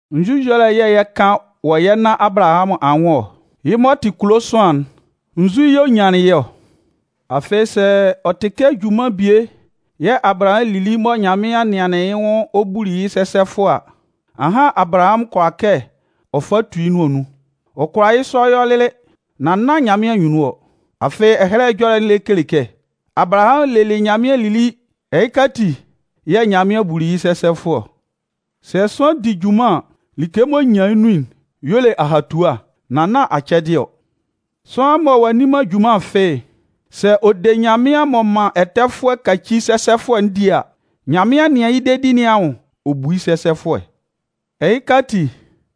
Nzu ɛjɔlɛ yɛ̂ yɛ 'kan wɔ yɛ nannan Abalahamʋn anwʋn ɔ? Yɩ́ m'ɔ tɩ kulo sʋanlan'n, nzu yɛ̂ ɔ nyanlɩn yɩ́ ɔ? Afɩ, sɛ ɔ tɩ kɛ junman bie yɛ̂ Abalahamʋn lili mɔ Nyanmɩan nɩanlɩn yɩ́ nwʋn ɔ buli yɩ́ sɛsɛfʋɛ a, ahan Abalahamʋn kʋala kɛ ɔ fa tu yɩ́ nʋan nun. Ɔ kʋala yɩ́ sɔ yɔ lɩlɩ, nan nán Nyanmɩan anyunnun ɔ. Afɩ, Ɛhɛlɛ Ɛjɔlɛ'n lɛ kele kɛ: Abalahamʋn lelɩ Nyanmɩan lili ɛhɩka ati yɛ̂ Nyanmɩan buli yɩ́ sɛsɛfʋɛ ɔ. Sɛ sʋanlan di junman an, like m'ɔ nyan yɩ́ nun'n y'ɔ le ahatua, nan nán acɛdɩɛ ɔ. Sʋanlan mɔ ɔ'a nni man junman fɩ́ɩ́'n, sɛ ɔ de Nyanmɩan m'ɔ man ɛtɛfʋɛ'n kaci sɛsɛfʋɛ'n di a, Nyanmɩan nɩan yɩ́ dedi nɩn anwʋn ɔ bu yɩ́ sɛsɛfʋɛ. Ɛhɩka ati,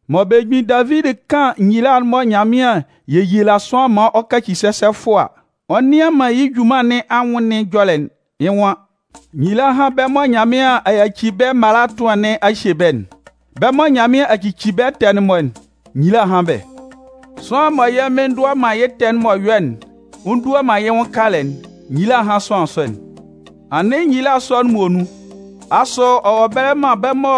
mɔ belemgbin Davidi 'kan nyila'n mɔ Nyanmɩan 'yeyila sʋanlan maan ɔ kaci sɛsɛfʋɛ a, ɔ nnɩan man yɩ́ junman nɩn anwʋn nɩn ɛjɔlɛ'n, yɩ́ nwan: Nyila hán bɛ́ mɔ Nyanmɩan a yaci bɛ́ mala ɛtʋan nɩn a hye bɛ́'n. Bɛ́ mɔ Nyanmɩan a cici bɛ́ ɛtɛ'n-mɔ, nyila hán bɛ́. Sʋanlan mɔ yɛ́ Mɩn ndʋa man yɩ́ ɛtɛ'n m'ɔ yɔ'n ɔ ndua man yɩ́ nwʋn kalɛ'n, nyila hán sʋanlan sɔ'n. Anɩn nyila sɔ'n muonun, asʋ ɔ wɔ ɛbɛlɛ man bɛ́ mɔ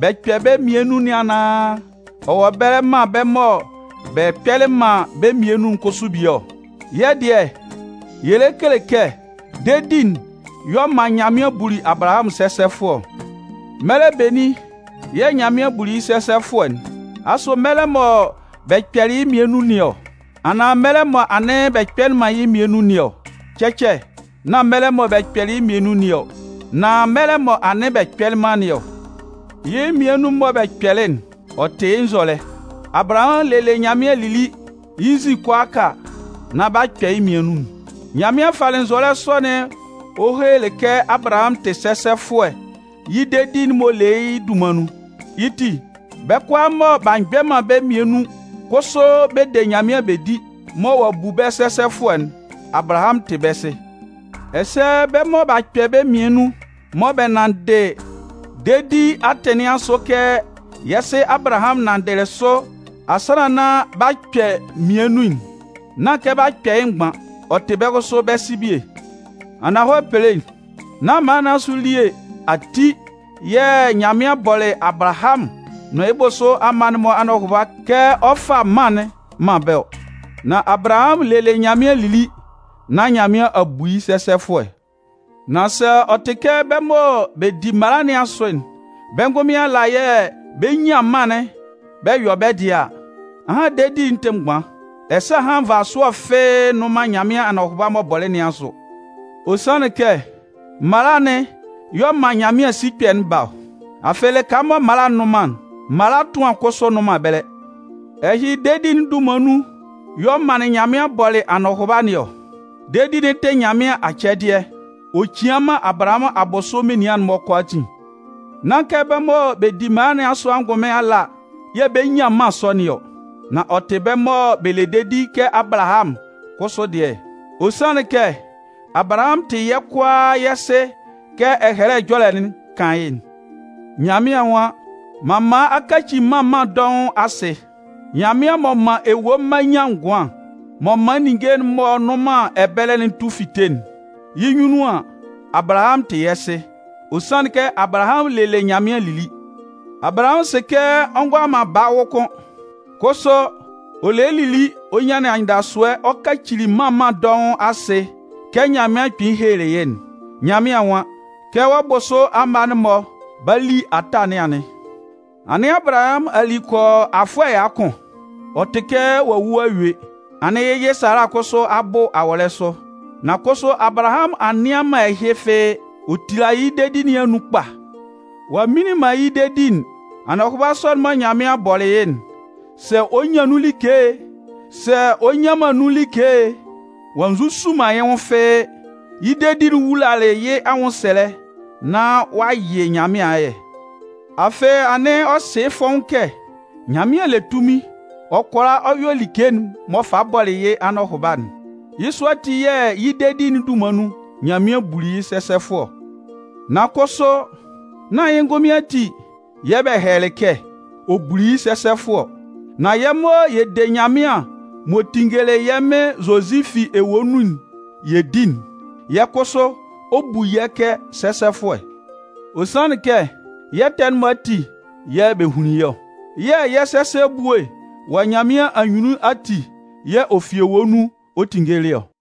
b'a kpɛ bɛ́ mmian nun nɩn anaan, ɔ wɔ ɛbɛlɛ man bɛ́ mɔ bɛ kpɛlɩ man bɛ́ mmian nun'n kʋsʋ bie ɔ? Yɛ́ dɩɛ, yɛ lɛ kele kɛ dedi'n y'ɔ man Nyanmɩan buli Abalahamʋn sɛsɛfʋɛ ɔ. Mɛlɛ benin yɛ̂ Nyanmɩan buli yɩ́ sɛsɛfʋɛ'n? Asʋ mɛlɛ mɔ bɛ kpɛlɩ yɩ́ mmian nun nɩn ɔ, anaan mɛlɛ mɔ anɩn bɛ kpɛlɩ man yɩ́ mmian nun nɩn ɔ? Cɛcɛ. Nán mɛlɛ mɔ bɛ kpɛlɩ yɩ́ mmian nun nɩn ɔ, nan mɛlɛ mɔ anɩn bɛ kpɛlɩ man nɩn ɔ. Yɩ́ mmian nun'n mɔ bɛ kpɛlɩ'n, ɔ tɩ yɩ́ nzɔlɛ. Abalahamʋn lelɩ Nyanmɩan lili, yɩ́ nzin kʋalaaka nán b'a kpɛ yɩ́ mmian nun'n. Nyanmɩan falɩ nzɔlɛ sɔ'n ɔ helelɩ kɛ Abalahamʋn tɩ sɛsɛfʋɛ yɩ́ dedi'n m'ɔ le yɩ́ dunman nun. Yɩ́ ti, bɛ́ kʋalaa mɔ b'a mgbɛ man bɛ́ mmian nun kʋsʋ bɛ de Nyanmɩan bɛ di, mɔ ɔ'a bu bɛ́ sɛsɛfʋɛ'n, Abalahamʋn tɩ bɛ́ sɩ. Ɛsɛ bɛ́ mɔ b'a kpɛ bɛ́ mmian nun, mɔ bɛ nanndɩ dedi atɩn nɩn asʋ kɛ yɛ́ sɩ Abalahamʋn nanndɩlɩ sʋ asannan nán b'a kpɛ mmian nun'n, nán kɛ b'a kpɛ yɩ́ mgban, ɔ tɩ bɛ́ kʋsʋ bɛ́ sɩ bie. Ananhɔlɛ pelein, nán mala nɩn asʋ elie ati yɛ̂ Nyanmɩan bɔlɩ Abalahamʋn nʋn yɩ́ bʋsʋ amma'n-mɔ anɔhʋba kɛ ɔ 'fa mân'n man bɛ́ ɔ. Nan Abalahamʋn lelɩ Nyanmɩan lili, nán Nyanmɩan a bu yɩ́ sɛsɛfʋɛ. Nan sɛ ɔ tɩ kɛ bɛ́ mɔ bɛ di mala nɩn asʋ'n, bɛ́ ngʋnmɩn ala yɛ̂ bɛ 'nyan mân'n bɛ yɔ bɛ́ dɩɛ a, ahan dedi'n tɩ mgban, ɛsɛ ahan nvasʋɛ fɩ́ɩ́ nnʋn man Nyanmɩan anɔhʋba'n m'ɔ bɔlɩ nɩn asʋ. Ɔ sanlɩn kɛ mala'n yɛ̂ ɔ man Nyanmɩan sikpɛ'n ba ɔ. Afɩ lɩka mɔ mala nnʋn man'n, mala ɛtʋan kʋsʋ nnʋn man ɛbɛlɛ. Ɛhɩ, dedi'n dunman nun y'ɔ manlɩn Nyanmɩan bɔlɩ anɔhʋba nɩn ɔ. Dedi'n tɩ Nyanmɩan acɛdɩɛ, ɔ cian man Abalahamʋn abʋsʋ menian'n-mɔ kʋalaatin. Nán kɛ bɛ́ mɔ bɛ di mala nɩn asʋ angʋnmɩn ala yɛ̂ bɛ 'nyan mân sɔ nɩn ɔ, nan ɔ tɩ bɛ́ mɔ bɛ le dedi kɛ Abalahamʋn'n kʋsʋ dɩɛ. Ɔ sanlɩn kɛ Abalahamʋn tɩ yɛ́ kʋalaa yɛ́ sɩ kɛ Ɛhɛlɛ Ɛjɔlɛ'n kan yɩ́'n. Nyanmɩan nwan: M'an man a kaci mân mân dɔʋn asɩ. Nyanmɩan m'ɔ man ewue mma nyan ngʋan, m'ɔ man ninnge m'ɔ nnʋn man ɛbɛlɛ tu fite'n, yɩ́ nyunnun an, Abalahamʋn tɩ yɛ́ sɩ. Ɔ sanlɩn kɛ Abalahamʋn lelɩ Nyanmɩan lili. Abalahamʋn sɩ kɛ ɔ ngʋala man baa wʋ kʋ́n. Kʋsʋ, ɔ lelɩ lili ɔ nyanlɩn anyɩndasʋɛ ɔ kacili “mân mân dɔʋn asɩ” kɛ Nyanmɩan kpɩnlɩn helelɩ yɩ́'n. Nyanmɩan nwan: Kɛ wɔ́ bʋsʋ amma'n-mɔ 'ba li ata nɩn anɩn. Anɩn Abalahamʋn a li kɔ yɔ afʋɛ ɛya kʋn, ɔ tɩ kɛ ɔ'a wu a yue. Anɩn yɩ́ yɩ Sala kʋsʋ a bʋ awɔlɛ sʋ. Nan kʋsʋ Abalahamʋn a nnɩan man ɛhɩ fɩ́ɩ́, ɔ tilalɩ yɩ́ dedi nɩn anun kpa. Ɔ'a mminlin man yɩ́ dedi'n, anɔhʋba sɔ'n mɔ Nyanmɩan bɔlɩ yɩ́'n, sɛ ɔ 'nyan nun like e, sɛ ɔ nnyan man nun like e, ɔ'a nzusu man yɩ́ nwʋn fɩ́ɩ́. Yɩ́ dedi'n wulalɩ yɩ́ anwʋnsɛlɛ, nán ɔ'a yɩ Nyanmɩan ayɛ. Afɩ, anɩn ɔ sɩ yɩ́ fɔ́ʋ́n kɛ Nyanmɩan le tunmin ɔ kʋala ɔ yɔ like'n m'ɔ falɩ bɔlɩ yɩ́ anɔhʋba'n. Yɩ́ sɔ ati yɛ̂ yɩ́ dedi'n dunman nun, Nyanmɩan buli yɩ́ sɛsɛfʋɛ ɔ. Nan kʋsʋ, nán yɩ́ ngʋnmɩn ati yɛ̂ bɛ hɛlɛlɩ kɛ: Ɔ buli yɩ́ sɛsɛfʋɛ ɔ. Nan yɛ́ mɔ yɛ de Nyanmɩan m'ɔ tinngelɩ yɛ́ Mɩn Zozi fi ewue nun'n yɛ di'n, yɛ́ kʋsʋ ɔ 'bu yɛ́ kɛ sɛsɛfʋɛ. Ɔ sanlɩn kɛ yɛ́ ɛtɛ'n-mɔ ati yɛ̂ bɛ hunlin yɩ́ ɔ. Yɛ̂ yɛ́ sɛsɛ ebue wɔ Nyanmɩan anyunnun ati yɛ̂ ɔ fi ewue nun ɔ tinngelɩ ɔ.